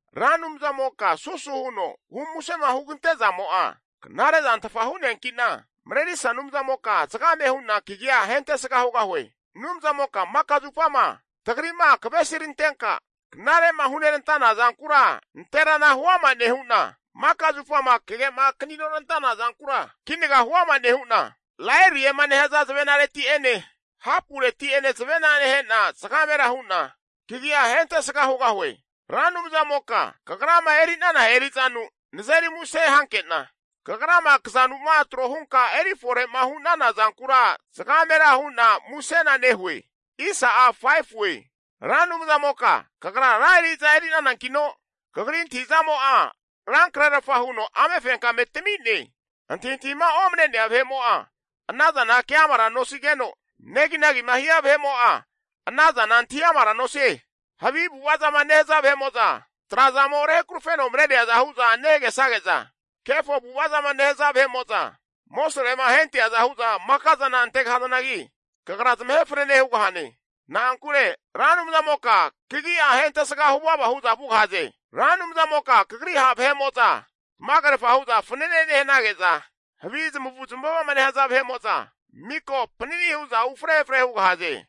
Ra Anumzamoka susu huno humusema hugante zamo'a knare'zantfa hu'neanki'na, Marerisa Anumzamoka zagame hu'na kagi'a ahentesga hugahue. Anumzamoka maka zupama tagri'ma kavesirantenka knare'ma hunerantana zankura nanterana huama nehu'na, maka zupama kage'ma kaninorantana zankura kinaga huama nehu'na, Laeriema nehaza zavenareti'ene, hapureti'ene zavena nehe'na, zagamera hu'na kagia ahentesga hugahue. Ra Anumzamoka Kagrama eri'nana eri'zanu nazeri muse hankena, Kagrama kazanu'ma tro hunka eri fore'ma hu'nana zankura zagamera hu'na musena nehue. Ra Anumzamoka kagra ra eri'za eri'nanankino, Kagri antahi'zamo'a rankrerfa huno amefenkame tami'ne. Antahintahima oma'ne vahe'mo'a ana zana keamara nosigeno, neginagima nehia vahe'mo'a ana zana antahiamara nosie. Havi avu'ava zama nehaza vahe'mo'za, trazamo rehakarufeno mareriaza hu'za nehagesage'za, kefo avu'ava zama nehaza vahe'mo'za amosrema ahenteaza hu'za makazana antegahazanagi, kagra zamahe fanene hugahane. Na'ankure Ra Anumzamoka kagi'a ahentesga hu vava hu'za vugahaze. Ra Anumzamoka kagri ha' vahe'mo'za tamagerfa hu'za fanane nehanage'za, havi zamavu zamava'ma nehaza vahe'mo'za miko panani hu'za ufre efre hugahaze.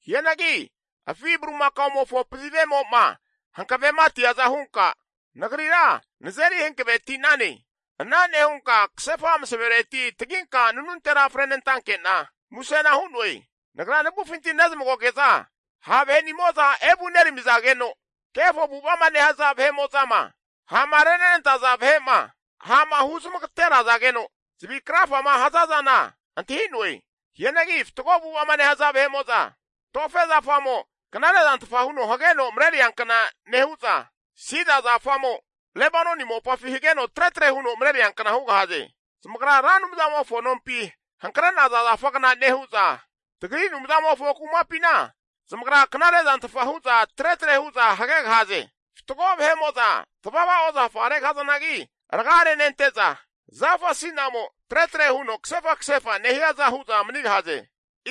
Hianagi afi bulimakaomofo pazivemo'ma hankavematiaza hunka, nagrira nazeri hankave ti'nane. Ana nehunka kasefa masavereti taginka nanuntera frenantanke'na musena hu'noe. Nagra navufinti nezmagoge'za ha' vahenimo'za evu neramizageno, kefo avu'ava'ma nehaza vahe'mo'zama, ha'ma renenantaza vahe'ma, ha'ma huzmagaterazageno zavi krafama haza zana antahi'noe. Hianagi fatgo avu'ava'ma nehaza vahe'mo'za, tofe zafamo knare zantfa huno hageno mareriankna nehu'za, sida zafamo Lebanoni mopafi hageno tretre huno mareriankna hugahaze. Zamagra Ra Anumzamofo nompi hankre'naza zafagna nehu'za, tagri Anumzamofo kumapina zamagra knare'zantfa hu'za tretre hu'za hagegahaze. Fatgo vahe'mo'za tavava ozafa regahazanagi raga renente'za, zafa asi'namo tretre huno kasefa kasefa nehiaza hu'za manigahaze.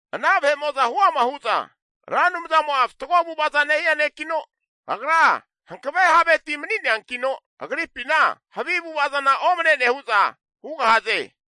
Ana vahe'mo'za huama hu'za, Ra Anumzamo'a fatgo avu'ava'za nehia nekino, Agra hankave havetia mani'neankino Agripina havi avu'ava zana omne'ne hu'za hugahaze.